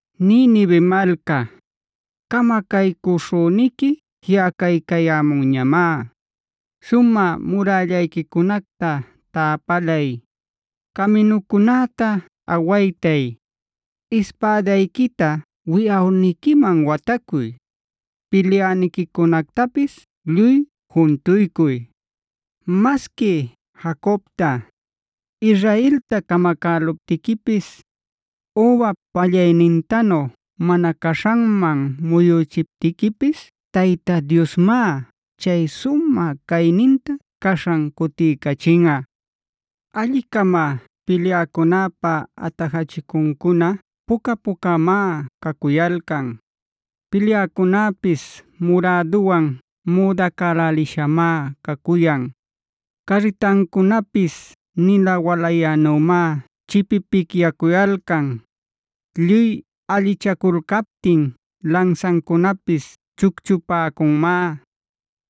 Ninive malca, camacaycuśhüniqui jiꞌacaycayämunñamá. Sumä murällayquicunacta täpalay, caminucunäta awaytay, ispädayquita wiyawniquiman watacuy, pilyäniquicunactapis lluy juntuycuy. Masqui Jacobta, Israelta camacäluptiquipis, übap pallaynintanu mana caśhanman muyüchiptiquipis Tayta Diosmá chay sumä cayninta caśhan cutiycachinꞌa. Alli-cama pilyäcunäpa atajachicuncuna puca-pucamá cacuyalcan; pilyäcunäpis muräduwan müdacälälishamá cacuyan. Carritancunapis nina walayänümá chipipicyacuyalcan; lluy allichaculcaptin lansancunapis chucchupäcunmá.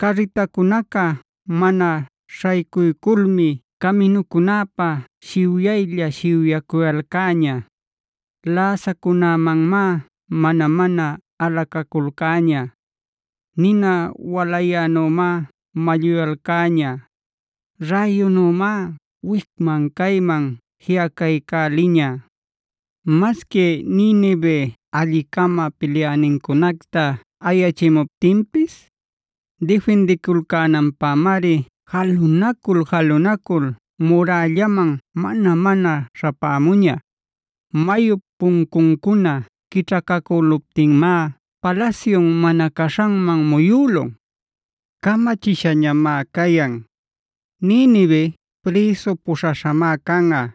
Carritacunaca mana śhaycuyculmi caminucunäpa shiwyaylla-shiwyacuyalcäña; läsacunämanmá mana-mana alacaculcäña. Nina walayänümá malluyalcäña; räyunümá wicman-cayman jiꞌacaycäliña. Masqui Ninive alli-cama pilyänincunacta ayachimuptinpis, difindiculcänanpämari jalunacul-jalunacul murällaman mana-mana śhapämuña. Mayup puncuncuna quićhacacüluptinmá palasyun mana caśhanman muyülun. Camachishañamá cayan: Ninivea prïsu puśhaśhamá canꞌa.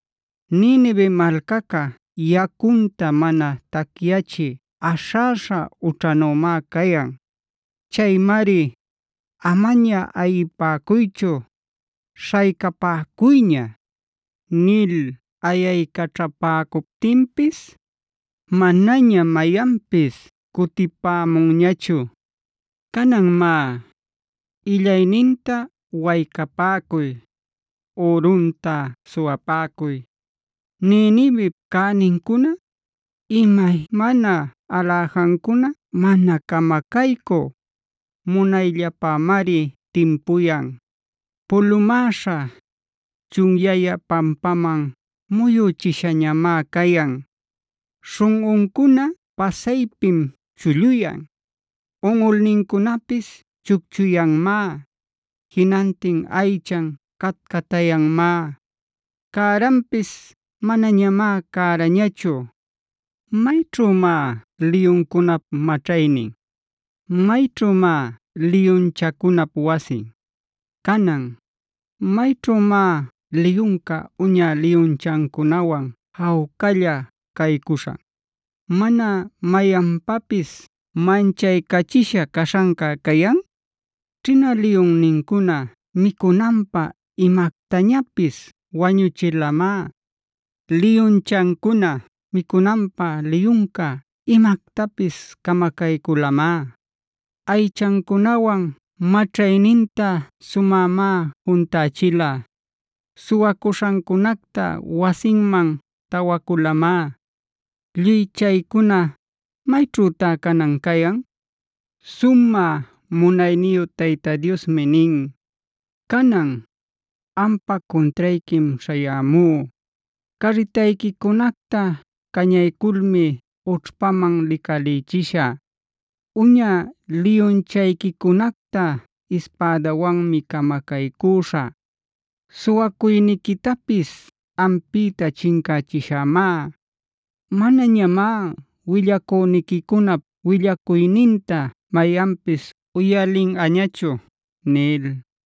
Ninive malcaca yacunta mana tacyachï aśhäśha ućhanümá cayan. Chaymari “¡Amaña ayipäcuychu; śhaycapäcuyña!” nil ayaycaćhapäcuptinpis, manaña mayanpis cutipämunñachu. Canan má, illayninta waycapäcuy; ürunta suwapäcuy. Ninivep cänincuna, imaymana aläjancuna mana camacaycü, munayllapämari timpuyan. Pulumäśha, chunyayä, pampaman muyüchishañamá cayan. Śhunꞌuncuna pasaypim chulluyan; unꞌulnincunapis chucchuyanmá; jinantin aychan catcatayanmá; cäranpis manañamá cärañachu. ¿Mayćhümá liyuncunap maćhaynin? ¿Mayćhümá liyunchacunap wasin? Canan, ¿mayćhümá liyunca uña liyunchancunawan jawcalla caycuśhan, mana mayanpapis manchaycachisha caśhanca cayan? Ćhina liyunnincuna micunanpä imactañapis wañuchilamá. Liyunchancuna micunanpä liyunca imactapis camacayculamá. Aychacunawan maćhayninta sumämá juntachila. Suwacuśhancunacta wasinman tawaculamá. Lluy chaycuna ¿mayćhütá canan cayan? Sumä munayniyu Tayta Diosmi nin: “Canan, ampa cuntrayquim śhayämú. Carritayquicunacta cañayculmi ućhpaman licalïchishä. Uña liyunchayquicunacta ispädawanmi camacaycüśhä. Suwacuyniquitapis ampïta chincächishämá; manañamá willacüniquicunap willacuyninta mayanpis uyalinꞌañachu” nil.